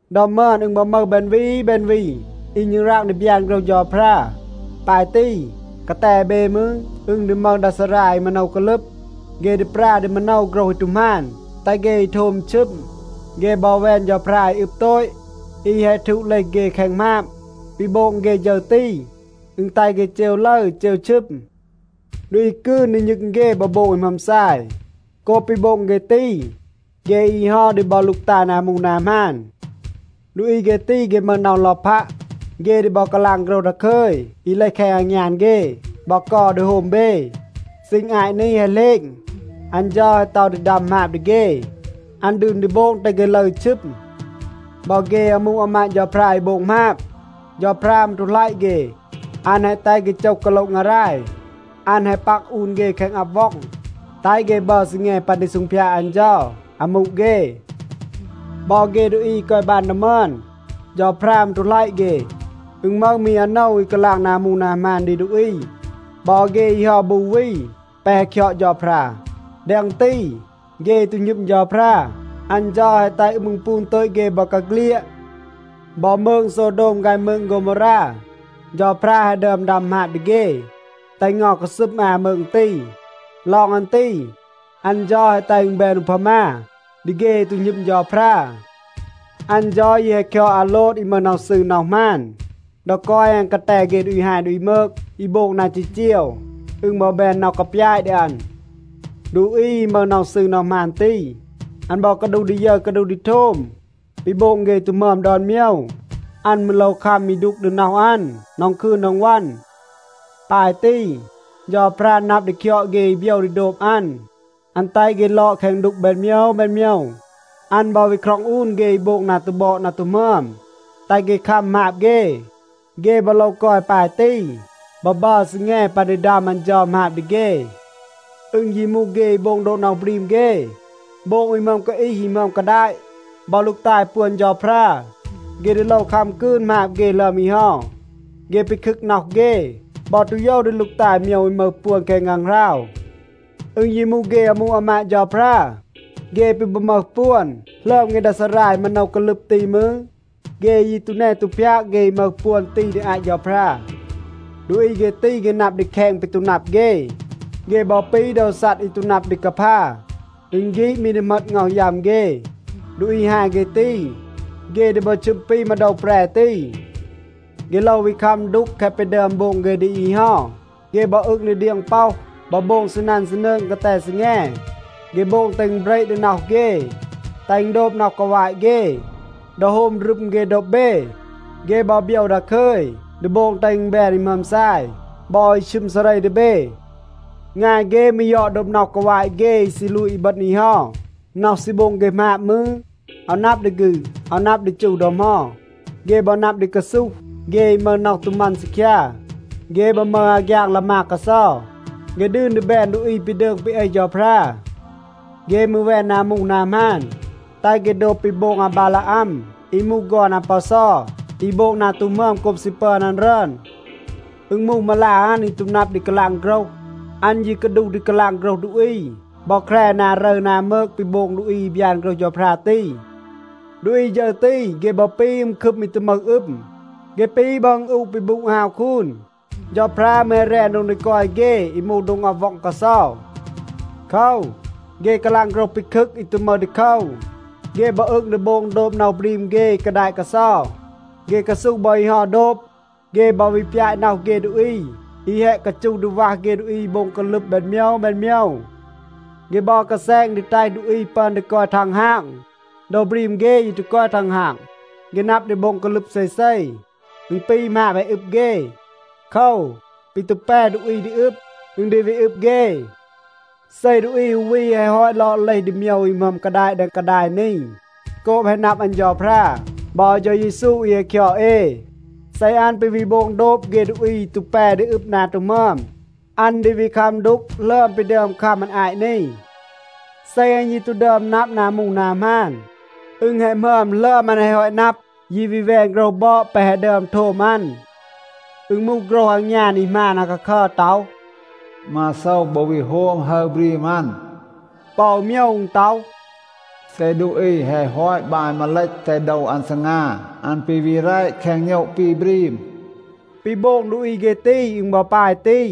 ดอ มึอน, อึณ บอ มึห แบน วี แบน วี อี ณึงราง ดี บยาน โฆรห เฌาพรา. ปาย ตี, กาแต เบ มืร, อึณ ดี มึห ดา ซารา อี มาโนว กาลึบ. เฆ ดี ปรา ดี มาโนว โฆรห อี ตู หมาน, แตห เฆ อี โทม ชึม. เฆ บอ แวน เฌาพรา อี อึบ โตต อี แฮะ ทูด เลห เฆ แคง หมาบ. ปี โบง เฆ ฌึร ตี, อึณ แตห เฆ เจว ลึร, เจว ชึม. ดูอี กืน ดี ณึง เฆ บอ โบง อี หมึอม ซาย. โกบ ปี โบง เฆ ตี, เฆ อี เฮา ดี บอ ลูกตาย นา มูห นา หมาน. ดูอี เฆ ตี, เฆ มึห น็อห ลอพัะ. เฆ ดี บอ กาลาง โฆรห ดาคึย อี เลห แคง อางยาน เฆ บอ เกา ดี โฮม เบ. ซีณ อาต นี แฮะ เหลณ, อัน เฌา แฮะ ต็อห ดี ดัม หมาบ ดี เฆ. อัน ดืน ดี โบง แตห เฆ ลึร ชึม. บอ เฆ อามู อามาด เฌาพรา อี โบง หมาบ, เฌาพรา มืร ตู หลัยะ เฆ. อัน แฮะ แตห เฆ โจห กาโละ งาราย. อัน แฮะ ปัก อูน เฆ แคง อับ ว็อง, แตห เฆ บัร ซีแง ปัน ดี ซูงพยาด อัน เฌา อามู เฆ. บอ เฆ ดูอี อี กอย บาน ดอ มึอน, เฌาพรา มืร ตู หลัยะ เฆ. อึณ มึห มี อาโนว อี กาลาง นา มูห นา หมาน ดี ดูอี บอ เฆ อี เฮา บู วี แปะ แฮะ คยอด เฌาพรา. แดง ตี, เฆ อี ตู หณึม เฌาพรา, อัน เฌา แฮะ แตห อึม อึณปูน โตต เฆ บอกาเฆลียด. บอ มืง โซวโดม ฆาย มืง โฆวโมวรา, เฌาพรา แฮะ ดึอม ดัม หมาบ ดี เฆ, แตห เงา กาซึม อา มืง ตี. ลอง อัน ตี, อัน เฌา แฮะ แตห อึณ แบน อูพามา ดี เฆ อี ตู หณึม เฌาพรา. อัน เฌา ยี แฮะ คยอด อาโลด อี มึห น็อห ซืร น็อห หมาน. ดอ กอย อัน กาแต เฆ ดูอี ฮาย ดูอี มืก อี โบง นา จีจีว, อึณ บอ แบน น็อห กาปยาต ดี อัน. ดูอี อี มึห น็อห ซืร น็อห หมาน ตี, อัน บอ กาดูห ดี ยึร กาดูห ดี โทม ปี โบง เฆ อี ตู หมึอม ดอน โมยว. อัน มืร โลว คัม อี ดูก ดี น็อห อัน ดอง คืน ดอง วัน. ปาย ตี, เฌาพรา นับ ดี คยอด เฆ อี โบยว ดี โดบ อัน. อัน แตห เฆ ลอด แคง ดูก แบน โมยว แบน โมยว. อัน บอ วี คร็อง อูน เฆ อี โบง นา ตู บอด นา ตู หมึอม, แตห เฆ คัม หมาบ เฆ. เฆ บอ โลว กอย ปาย ตี บอ บัร ซีแง ปัน ดี ดัม อัน เฌา หมาบ ดี เฆ. อึณ ยี มูห เฆ อี โบง โดบ น็อห บรีม เฆ, โบง อี หมึอม กาอีห อี หมึอม กาดาต, บอ ลูกตาย ปวน เฌาพรา, เฆ ดี โลว คัม กืน หมาบ เฆ หลึอม อี เฮา. เฆ ปีคึก น็อห เฆ บอ ตู โยว ดี ลูกตาย โมยว อี มึห ปวน แคง ฆางหราว. อึณ ยี มูห เฆ อามู อามาด เฌาพรา, เฆ ปี บอ มึห ปวน หลึอม เฆ ดา ซารา อี มาโนว กาลึบ ตี มืร, เฆ ยี ตู แน ตู พยาก เฆ อี มึห ปวน ตี ดี อาต เฌาพรา. ดูอี เฆ ตี, เฆ นับ ดี แคณ ปี ตู นับ เฆ. เฆ บอ ปี โดว ซัด อี ตู นับ ดี กาพา. อึณ ฆีด มี ดี เหมต ง็อห ยัม เฆ. ดูอี ฮาย เฆ ตี, เฆ ดี บอ ชึม ปี มาโดว แปร ตี. เฆ โลว วี คัม ดูก แคะ ปี ดึอม โบง เฆ ดี อี เฮา. เฆ บอ อึง ดี เดียง ป็อห บอ โบง ซีนัน ซีนืง กาแต ซีแง. เฆ โบง แตห อึณ เบระ ดี น็อห เฆ, แตห อึณ โดบ น็อห กาวาต เฆ. ดอ โฮม รึม เฆ โดบ เบ, เฆ บอ โบยว ดาคึย ดี โบง แตห อึณ แบน อี หมึอม ซาย บอ อี ชึม ซาเร ดี เบ. งาย เฆ มืร ยอด โดบ น็อห กาวาต เฆ อี ซี ลูต อีบึณ อี เฮา. น็อห ซี โบง เฆ หมาบ มืร, อาว นับ ดี ฆืด, อาว นับ ดี จู ดอ เหมา. เฆ บอ นับ ดี กาซูห เฆ อี มึห น็อห ตู มัน ซีคยา. เฆ บอ มึห อาฆยาง ลามาก กาเซา. เฆ ดืน ดี แบน ดูอี ปี ดืง ปี เอห เฌาพรา. เฆ มืร แวน นา มูห นา หมาน, แตห เฆ โดบ ปี โบง อาบาลาอัม อี มูห ฆอน อาปอซอ, อี โบง นา ตู หมึอม โกบ ซี ปึอน อัน รึอน. อึณ มูห มาลา อัน อี ตู นับ ดี กาลาง โฆรห. อัน ยี กาดูห ดี กาลาง โฆรห ดูอี บอ แคร นา รึร นา มืก ปี โบง ดูอี อี บยาน โฆรห เฌาพรา ตี. ดูอี ฌึร ตี, เฆ บอ ปี อึม คึม อี ตู มึห อึม. เฆ ปี บอ อึณอูะ ปี บูด ฮาว คูน. เฌาพรา มืร แฮะ แรน โดง ดี กอย เฆ อี มูห โดง อับ ว็อง กาเซา. โคว, เฆ กาลาง โฆรห ปีคึก อี ตู มึห ดีโคว. เฆ บอ อึง ดี โบง โดบ น็อห บรีม เฆ อี กาดาต กาเซา. เฆ กาซูห บอ อี เฮา โดบ. เฆ บอ วี ปยาต น็อห เฆ ดูอี อี แฮะ กาจูห ดี วัห เฆ ดูอี อี โบง กาลึบ แบน โมยว แบน โมยว. เฆ บอ กาแซณ ดี แตห ดูอี ปึอน ดี กอย ทังฮาง. โดว บรีม เฆ ยี ตู กอย ทังฮาง. เฆ นับ ดี โบง กาลึบ เซเซ. อึณ ปี หมาบ แฮะ อึบ เฆ. โคว, ปี ตู แป ดูอี ดี อึบ, อึณ ดี วี อึบ เฆ. เซ ดูอี อู วี แฮะ ฮอต ลอด เลห ดี โมยว อี หมึอม กาดาต แดง กาดาย นี โกบ แฮะ นับ อัน เฌาพรา บอ เฌา เยซู อี แฮะ คยอด เอ, เซ อัน ปี วี โบง โดบ เฆ ดูอี อี ตู แป ดี อึบ นา ตู หมึอม, อัน ดี วี คัม ดูก หลึอม ปี ดึอม คัม อัน อาต นี. เซ อัน ยี ตู ดึอม นับ นา มูห นา หมาน, อึณ แฮะ หมึอม หลึอม อัน แฮะ ฮอต นับ, ยี วี แวน โฆรห บอด แปะ แฮะ ดึอม โทม อัน. อึณ มูห โฆรห อางยาน อี หมาน อาคาคัร ต็อห, “มาโซว บอ วี โฮม ฮึร บรีม อัน.” ปอ อู โมยว อึณ ต็อห, “เซ ดูอี แฮะ ฮอต บาย มาเลต, แตห โดว อัน ซีงา, อัน ปี วี แร แคง โณะ ปี บรีม.” ปี โบง ดูอี เฆ ตี, อึณ บอ ปาย ตี.